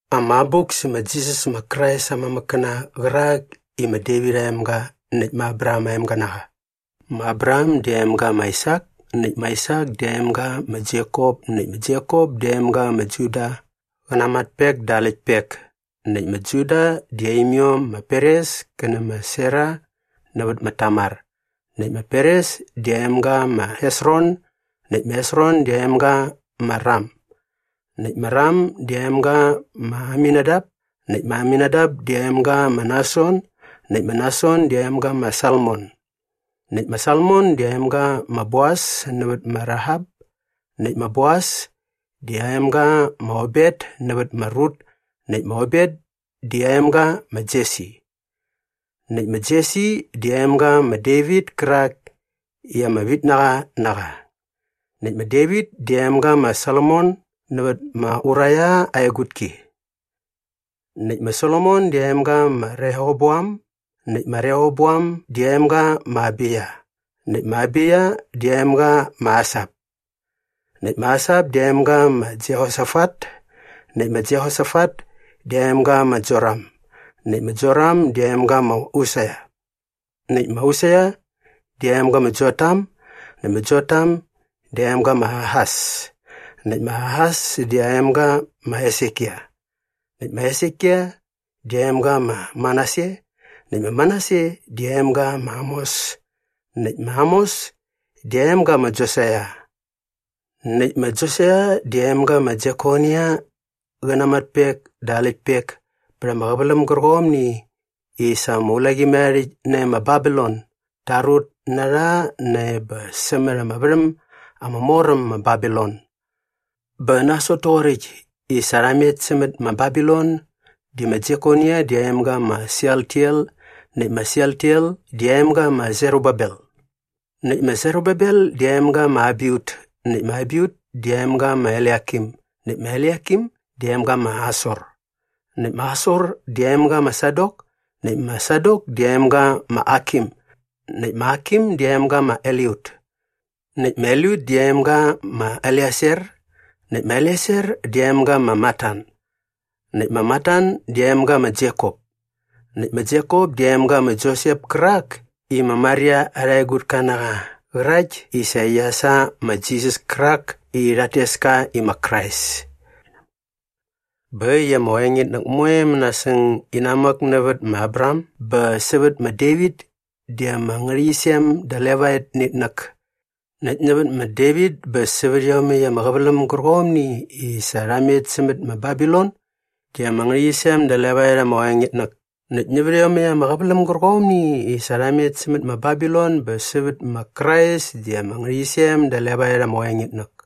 Ama abuk sä ma Jisas ma Krais aa mamäkkäna qärak i ma Devit aa emga näkt ma Abraham aa emga na qa. Ma Abraham di aa emga ma Aisak näkt ma Aisak di aa emga ma Jekop näkt ma Jekop di aa emga ma Juda qä na aa matpek dä aa läktpek. Näkt ma Juda di aa imiom ma Peres kä nä ma Sera nävät ma Tamar. Näkt ma Peres di aa emga ma Hesron näkt ma Hesron di aa emga ma Ram. Näkt ma Ram di aa emga ma Aminadap näkt ma Aminadap di aa emga ma Nason näkt ma Nason di aa emga ma Salmon. Näkt ma Salmon di aa emga ma Boas nävät ma Rahap näkt ma Boas di aa emga ma Obet nävät ma Rut näkt ma Obet di aa emga ma Jesi. Näkt ma Jesi di aa emga ma Devit kärak i ama vitnaqa na qa. Näkt ma Devit di aa emga ma Solomon nävät ma Uraia aa egutki. Näkt ma Solomon di aa emga ma Rehoboam näkt ma Rehoboam di aa emga ma Abiya näkt ma Abiya di aa emga ma Asap. Näkt ma Asap di aa emga ma Jehosafat näkt ma Jehosafat di aa emga ma Joram näkt ma Joram di aa emga ma Usia. Näkt ma Usia di aa emga ma Jotam näkt ma Jotam di aa emga ma Ahas näkt ma Ahas di aa emga ma Hesekia. Näkt ma Hesekia di aa emga ma Manase näkt ma Manase di aa emga ma Amos näkt ma Amos di aa emga ma Josaia. Näkt ma Josaia di aa emga ma Jekonia qä na aa matpek dä aa läktpek pät ama qäväläm gärqomni i sa ama ulaqimärharhärhäkt nae ma Babilon da rut na rha nae bä sämät ama värhäm ama mor äm ma Babilon. Bä nasot toqoräkt i sa rha met sämät ma Babilon di ma Jekonia di aa emga ma Sealtiel näkt ma Sealtiel di aa emga ma Serubabel. Näkt ma Serubabel di aa emga ma Abiut näkt ma Abiut di aa emga ma Eliakim näkt ma Eliakim di aa emga ma Asor. Näkt ma Asor di aa emga ma Sadok näkt ma Sadok di aa emga ma Akim näkt ma Akim di aa emga ma Eliut. Näkt ma Eliut di aa emga ma Eleasar näkt ma Eleasar di aa emga ma Matan näkt ma Matan di aa emga ma Jekop. Näkt ma Jekop di aa emga ma Josep kärak i ma Maria arha egutka na qa qärakt i sa qia sa ma Jisas kärak i rhat tes ka i ma Krais. Bä äkt i ama qoengitnäk moe mänasäng inamäk nävät ma Abraham bä sävät ma Devit di ama ngärhäqyisem da levaet nä itnäk näkt nävät ma Devit bä sävät iomäkt ama qäväläm gärqomni i sa rha met sämät ma Babilon di ama ngärhäqyisem da levaet ama qoengitnäk näkt nävät iomäkt ama qäväläm gärqomni i sa rha met sämät ma Babilon bä sävät ma Krais di ama ngärhäqyisem da levaet ama qoengitnäk.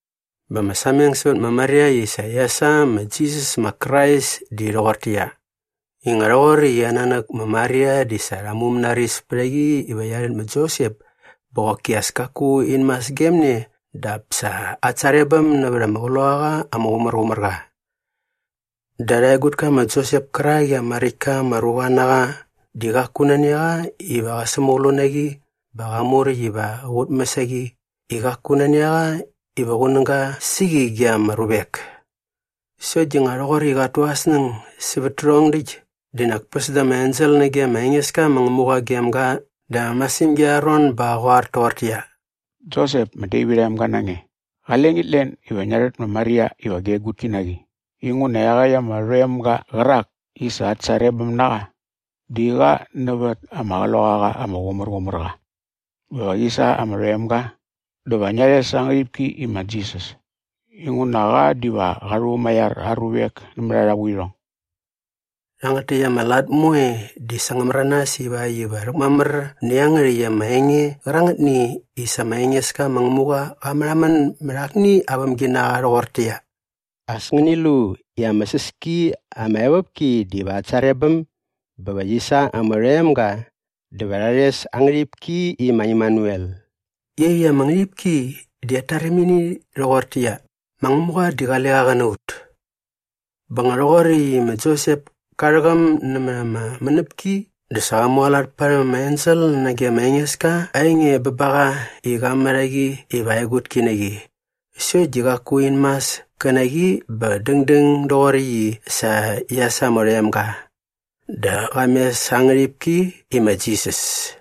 Bä ama sameng sävät ma Maria i sa qia sa ma Jisas ma Krais di rhoqortäqyia, i nga rhoqoräkt i aa nanäk ma Maria di sa rha mumänaris pät a qi iva qia rhät ma Josep bä qoki as kaku in mas gem ne dap sa at sarebäm nävät ama Qloqaqa ama Qumärqumärqa. Dä arha egutka ma Josep kärak i ama räkt ka ama ruqa na qa di qaku nani a qa iva qä sämäqlu na qi bä qa muräkt iva qä qutmäs a qi i qaku nani a qa iva qunäga sä qi ge ama ruvek. Sokt di nga rhoqoräkt i qat tu aa snäng sävät tärhong däkt di nak päs da ama ensel nage ma Engeska ma Ngämuqa gem ga da ama masirhämgi arha ron bä qä qoar toqortäqyia, “Josep, ma Devit aa emga na nge, qale ngit len iva ngia rhät ma Maria iva gia egutki na qi inguna iaqäkt ama rhoemga qärak i sa at sarebäm na qa di qa nävät ama Qloqaqa ama Qumärqumärqa. Bä va qi sa ama rhoemga dä va ngia rhes aa ngärhipki i ma Jisas inguna qa diva qa rhumaiar aa ruvek nämät arha vuirhong.” Rhangät täkt ama lat moe di sa ngä märanas ivakt iva rhäkmamär nä iangärhäkt ama enge qärangätni i sa ma Engeska ma Ngämuqa qa märhamän mät akni aa vämginaqa rhoqortäqyia, “As ngäni lu i ama säs ki ama evopki diva at sarebäm bä va qi sa ama rhoemga dä va rha rhes aa ngärhipki i ma Imanuel” i iaqyäkt ama ngärhipki di at tarimini rhoqortäqyia, ma Ngämuqa di qale qa qä na ut. Bä nga rhoqoräkt i ma Josep ka rhäqäm nämät ama mänäpki dä sa qa mualat parhäm ama ensel nage ma Engeska aa enge bä ba qa i qa mät a qi iva aa egutki na qi sokt di qaku in mas kä na qi bä dängdäng doqoräkt i sa qia sa ama rhoemga. Dä qa mes aa ngärhipki i ma Jisas.